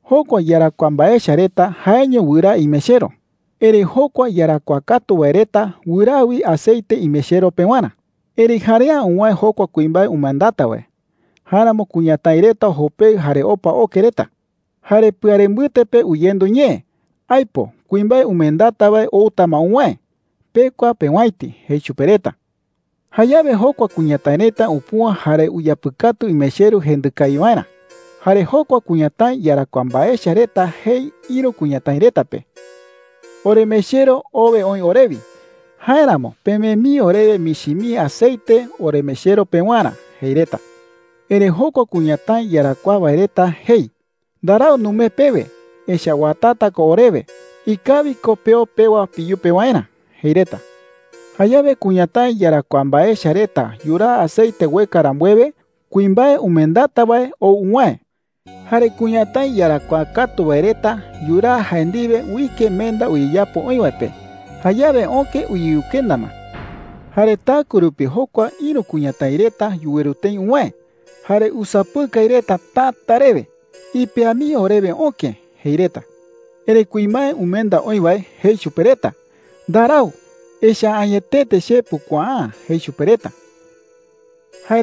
Jokua iyarakuaa mbae echa reta jaeño wɨraa imechero. Erëi jokua iyarakuaa katu wae reta wɨraa wi aceite imechero pewarä,” jei. “Erëi jarea’ä uwäe jokua kuimbae umendata wae. Jáeramo kuñatái reta jopeɨ jare opa oke reta,” jei. “Jare pɨare mbɨte pe uyendu ñee: ‘¡Aipo! Kuimbae umendata wae outa ma uwäe. Pekua peowäiti,’ jei chupe reta. Jayawe jokua kuñatái reta upüa jare uyapɨkatu imechero jendɨ kawi waerä. Jare jokua kuñatái iyarakuaa mbae echa reta jei ïru kuñatái reta pe: “Oremechero owe oï orewi. Jáeramo pemee mii orewe michi mii aceite oremechero pewarä,’ jei reta. “Erëi jokua kuñatái iyarakuaa wae reta jei: “Ndarau numee pewe, echa’ä uatata ko orewe. Ikawi ko peo pewa peyupe waerä,’ jei reta. “Jayawe kuñatái iyarakuaa mbae echa reta yuraa aceite ueka rambuewe, kuimbae umendata wae ou uwäe. Jare kuñatái iyarakuaa katu wae reta yuraa jae ndiwe uike menda uyeyapo oï wae pe. Jayawe öke uyeyukenda ma,” jei. “Jare taɨkue rupi jokua ïru kuñatái reta yuweru tëi uwäe jare usapɨkai reta täta rewe: ‘Ipea mii orewe öke,’ jei reta. Erëi kuimbae umenda oï wae jei chupe reta: ‘Ndarau. Echa’ä añetete che pukuaa’ä,’ jei chupe reta,” jei.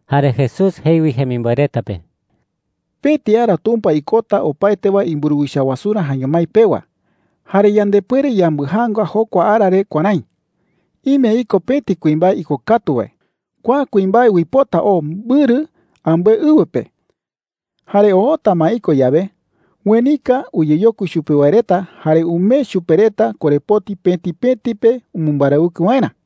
Jare Jesús jei wi jemimboe reta pe: “Pëti ara Tumpa ikota opaete wae imburuwicha wasurä jaeño mái pewa. Jare yandepuere yambɨjaanga jokua ara re kuärái: Ime iko pëti kuimbae ikokatu wae. Kua kuimbae uipota oo mbɨrɨ ambɨe ɨwɨ pe. Jare oota ma iko yawe, uenika uyeyokui chupe wae reta jare umee chupe reta korepoti pëti pëti pe umɨmbarawɨkɨ waerä,” jei.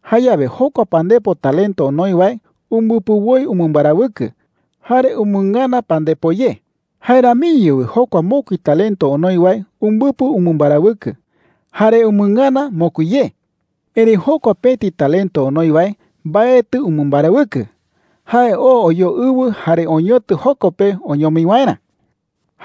“Jayawe jokua pandepo talento onoi wae umbɨpɨ woi umɨmbarawɨkɨ, jare umɨngana pandepo ye,” jei. “Jae ramiño wi jokua mokui talento onoi wae umbɨpɨ umɨmbarawɨkɨ, jare umɨngana mokui ye,” jei. “Erëi jokua pëti talento onoi wae mbaetɨ umɨmbarawɨkɨ. Jae oo oyoo ɨwɨ jare oñotɨ joko pe oñomi waerä,” jei chupe reta.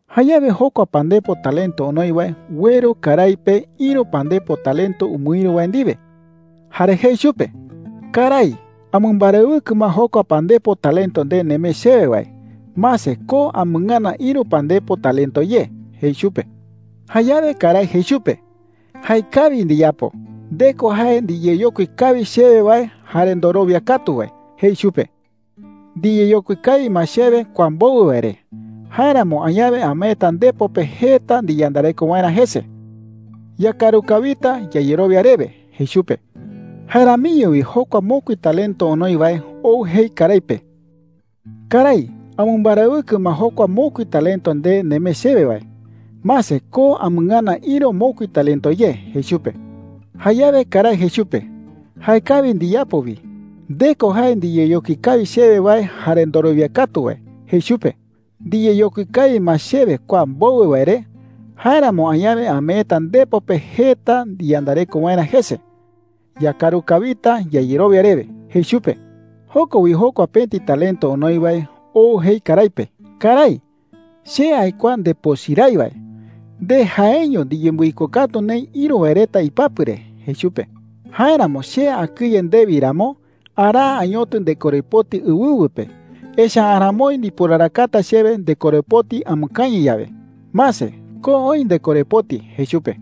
“Jayawe jokua pandepo talento onoi wae ueru karái pe ïru pandepo talento umɨïru wae ndiwe, jare jei chupe: ‘Karái, amɨmbarawɨkɨ ma jokua pandepo talento nde nemee chewe wae. Mase, ko amɨngana ïru pandepo talento ye,’ jei chupe. “Jayawe karái jei chupe: ‘Jaekawi ndiyapo. Nde ko jae ndiyeyokui kawi chewe wae jare ndorowia katu wae,’ jei chupe. ‘Ndiyeyokui kawi ma chewe kua mbowɨ wae re. Jáeramo añawe ameeta ndepo pe jeta ndiyandareko waerä jese. Yakaru kawita yayerowia rewe,’ jei chupe,” jei. “Jae ramiño wi jokua mokui talento onoi wae ou jei karái pe: ‘Karái, amɨmbarawɨkɨ ma jokua mokui talento nde nemee chewe wae. Mase, ko amɨngana ïru mokui talento ye,’ jei chupe. “Jayawe karái jei chupe: ‘Jaekawi ndiyapo wi. Nde ko jae ndiyeyokui kawi chewe wae jare ndorowia katu wae,’ jei chupe. ‘Ndiyeyokui kawi ma chewe kua mbowɨ wae re. Jáeramo añawe ameeta ndepo pe jeta ndiyandareko waerä jese. Yakaru kawita yayerowia rewe,’ jei chupe,” jei. “Joko wi jokua pëti talento onoi wae ou jei karái pe: ‘Karái, che aikuaa ndepochɨ rái wae. Nde jaeño ndiyembɨikokatu neï ïru wae reta ipapɨ re,’ jei chupe. ‘Jáeramo che akɨye ndewi ramo, araa añotɨ ndekorepoti ɨwɨwɨ pe. Echa’ä aramoi ndiporarakata chewe ndekorepoti amɨkañɨ yawe. Mase, ko oï ndekorepoti,’ jei chupe.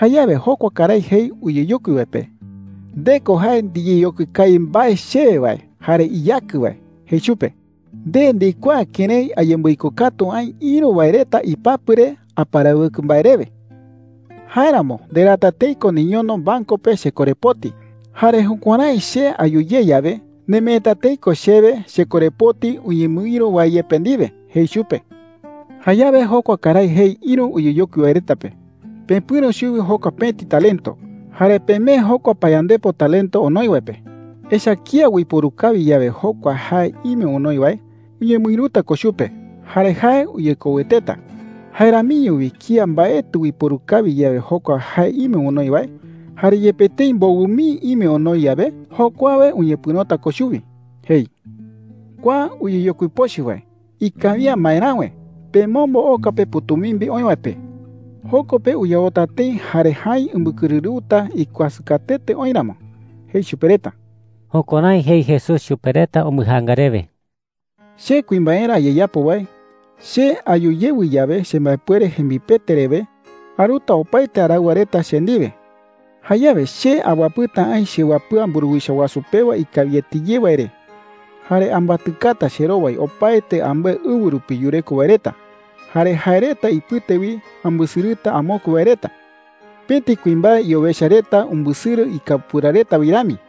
“Jayawe jokua karái jei uyeyokui wae pe: ‘Nde ko jae ndiyeyokui kawi mbae chewe wae jare iyakɨ wae,’ jei chupe. ‘Nde ndikuaa kërái ayembɨikokatu aï ïru wae reta ipapɨ re aparawɨkɨ mbae rewe. Jáeramo nderaata tëi ko niñono banco pe chekorepoti. Jare jukuärái che ayu ye yawe, nemeeta tëi ko chewe chekorepoti uñemɨïru wae yepe ndiwe,’ jei chupe,” jei. “Jayawe jokua karái jei ïru uyeyokui wae reta pe: ‘Pepɨ̈ro chuwi jokua pëti talento, jare pemee jokua payandepo talento onoi wae pe. Echa’ä kía uiporu kawi yawe jokua jae ime onoi wae, uñemɨïruta ko chupe jare jae uyekoueteta. Jae ramiño wi kía mbaetɨ uiporu kawi yawe jokua jae ime onoi wae, jare yepe tëi mbowɨ mii ime onoi yawe, jokuawe uñepɨ̈rota ko chuwi,’ jei. ‘Kua uyeyokui pochɨ wae, ikawi’ä maeräwe. Pemombo oka pe pɨ̈tumimbi oï wae pe. Joko pe uyaota tëi jare jäi umbɨkɨrɨrɨuta ikuasɨ katuete oï ramo,’ jei chupe reta.” Jukuärái jei Jesús chupe reta umbɨjaanga rewe. “Che kuimbaerä ayeyapo wae, che ayu yewɨ yawe chembaepuere jembipete rewe, aruta opaete araɨwa reta che ndiwe. Jayawe che awapɨta aï chewapɨa mburuwicha wasu pewa ikawiete ye wae re,” jei. “Jare ambatɨkata cherowai opaete ambɨe ɨwɨ rupi yureko wae reta. Jare jae reta ipɨte wi ambɨsɨrɨta amokue wae reta, pëti kuimbae iowecha reta umbɨsɨrɨ ikapura reta wi rami,” jei.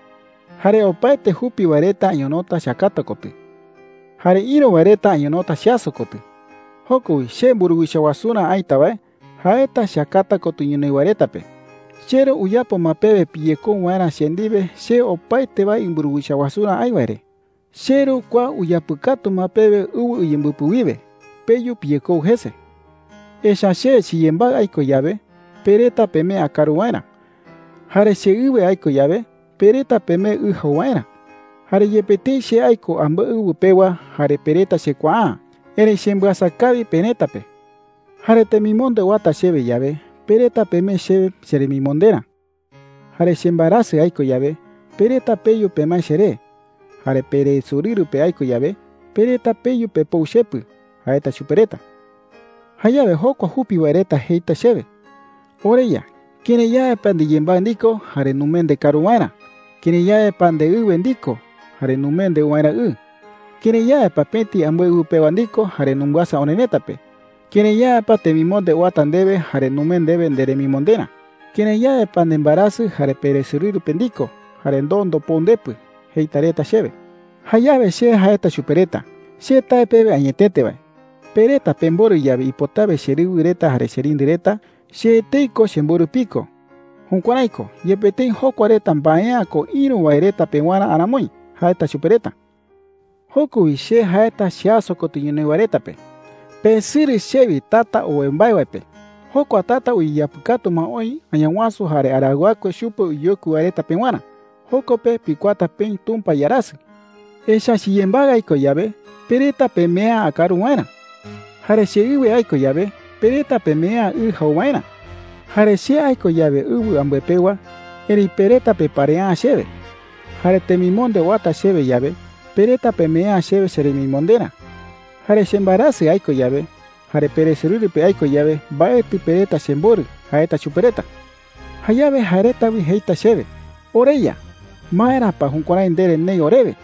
“Jare opaete jupi wae reta añonota cheakata kotɨ. Jare ïru wae reta añonota cheaso kotɨ,” jei chupe reta. “Joko wi che mburuwicha wasurä aïta wae, jaeta cheakata kotɨ ñonoï wae reta pe: ‘CheRu uyapo ma pewe piyekou waerä che ndiwe che opaete wae imburuwicha wasurä aï wae re. CheRu kua uyapɨkatu ma pewe ɨwɨ uyembɨpɨ wiwe. Peyu piyekou jese. Echa’ä che chiyembaɨ aiko yawe, pe reta pemee akaru waerä. Jare cheɨwe aiko yawe, pe reta pemee ɨ jau waerä. Jare yepe tëi che aiko ambɨe ɨwɨ pewa jare pe reta chekuaa’ä, erëi chembɨasa kawi perëta pe. Jare temimonde uata chewe yawe, pe reta pemee chewe cheremimonderä. Jare chembaerasɨ aiko yawe, pe reta peyu pemae cheré. Jare peresorɨru pe aiko yawe, pe reta peyu pepou chepɨ,’ jaeta chupe reta,” jei. “Jayawe jokua jupi wae reta jeita chewe: ‘OreYa, ¿kërái yawe pa ndiyembaɨ ndiko jare numee ndekaru waerä? ¿Kërái yawe pa ndeɨwe ndiko jare numee ndeu waerä ɨ? ¿Kërái yawe pa pëti ambɨe ɨwɨ pewa ndiko jare numbɨasa orerëta pe? ¿Kërái yawe pa temimonde uata ndewe jare numee ndewe nderemimonderä? ¿Kërái yawe pa nembaerasɨ jare peresorɨru pe ndiko, jare ndoo ndopou ndepɨ?’ jeita reta chewe,” jei. “Jayawe che jaeta chupe reta: ‘Che tae pewe añetete wae, pe reta pemborɨ yawe ipotawe cherɨwɨ reta jare cherindɨ reta, che etei ko chemborɨ piko. Jukuärái ko, yepe tëi jokua reta mbae’ä ko ïru wae reta pewarä aramoi,’ jaeta chupe reta,” jei. “Joko wi che jaeta cheaso kotɨ ñonoï wae reta pe: ‘Pesɨrɨ chewi tata owe mbae wae pe. Jokua tata uyeyapɨkatu ma oï Añawasu jare araɨwakue chupe uyeyokui wae reta pewarä. Joko pe pikuaata peï Tumpa iarasɨ. Echa’ä chiyembaɨ aiko yawe, pe reta pemee’ä akaru waerä. Jare cheɨwe aiko yawe, pe reta pemee’ä ɨ jau waerä. Jare che aiko yawe ɨwɨ ambɨe pewa, erëi pe reta peparea’ä chewe. Jare temimonde uata chewe yawe, pe reta pemee’ä chewe cheremimonderä. Jare chembaerasɨ aiko yawe jare peresorɨru pe aiko yawe, mbaetɨ pe reta chemborɨ,’ jaeta chupe reta,” jei. “Jayawe jae reta wi jeita chewe: ‘OreYa, ¿maera pa jukuärái ndere neï orewe?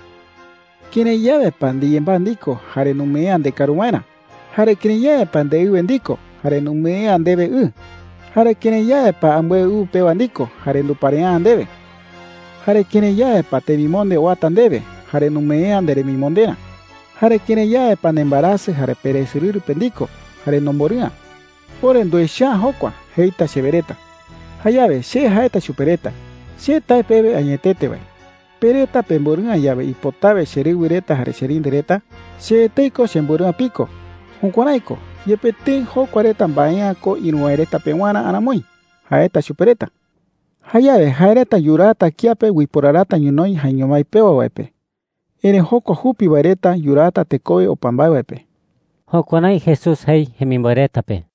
¿Kërái yawe pa ndiyembaɨ ndiko jare numee’ä ndekaru waerä? Jare ¿kërái yawe pa ndeɨwe ndiko jare numee’ä ndewe ɨ? Jare ¿kërái yawe pa ambɨe ɨwɨ pewa ndiko jare nduparea’ä ndewe? Jare ¿kërái yawe pa temimonde uata ndewe jare numee’ä nderemimonderä? Jare ¿kërái yawe pa nembaerasɨ jare peresorɨru pe ndiko, jare nomborɨ'ä? Ore nduecha’ä jokua,’ jeita chewe reta,” jei. “Jayawe che jaeta chupe reta: ‘Che tae pewe añetete wae, pe reta pemborɨ'ä yawe ipotawe cherɨwɨ reta jare cherindɨ reta, che etei ko chemborɨ'ä piko. Jukuärái ko, yepe tëi jokua reta mbae’ä ko ïru wae reta pewarä aramoi,’ jaeta chupe reta,” jei. “Jayawe jae reta yuraata kiape uiporarata ñonoï jaeño mái pewa wae pe. Erëi jokua jupi wae reta yuraata tekowe opa mbae wae pe.” Jukuärái Jesús jei jemimboe reta pe.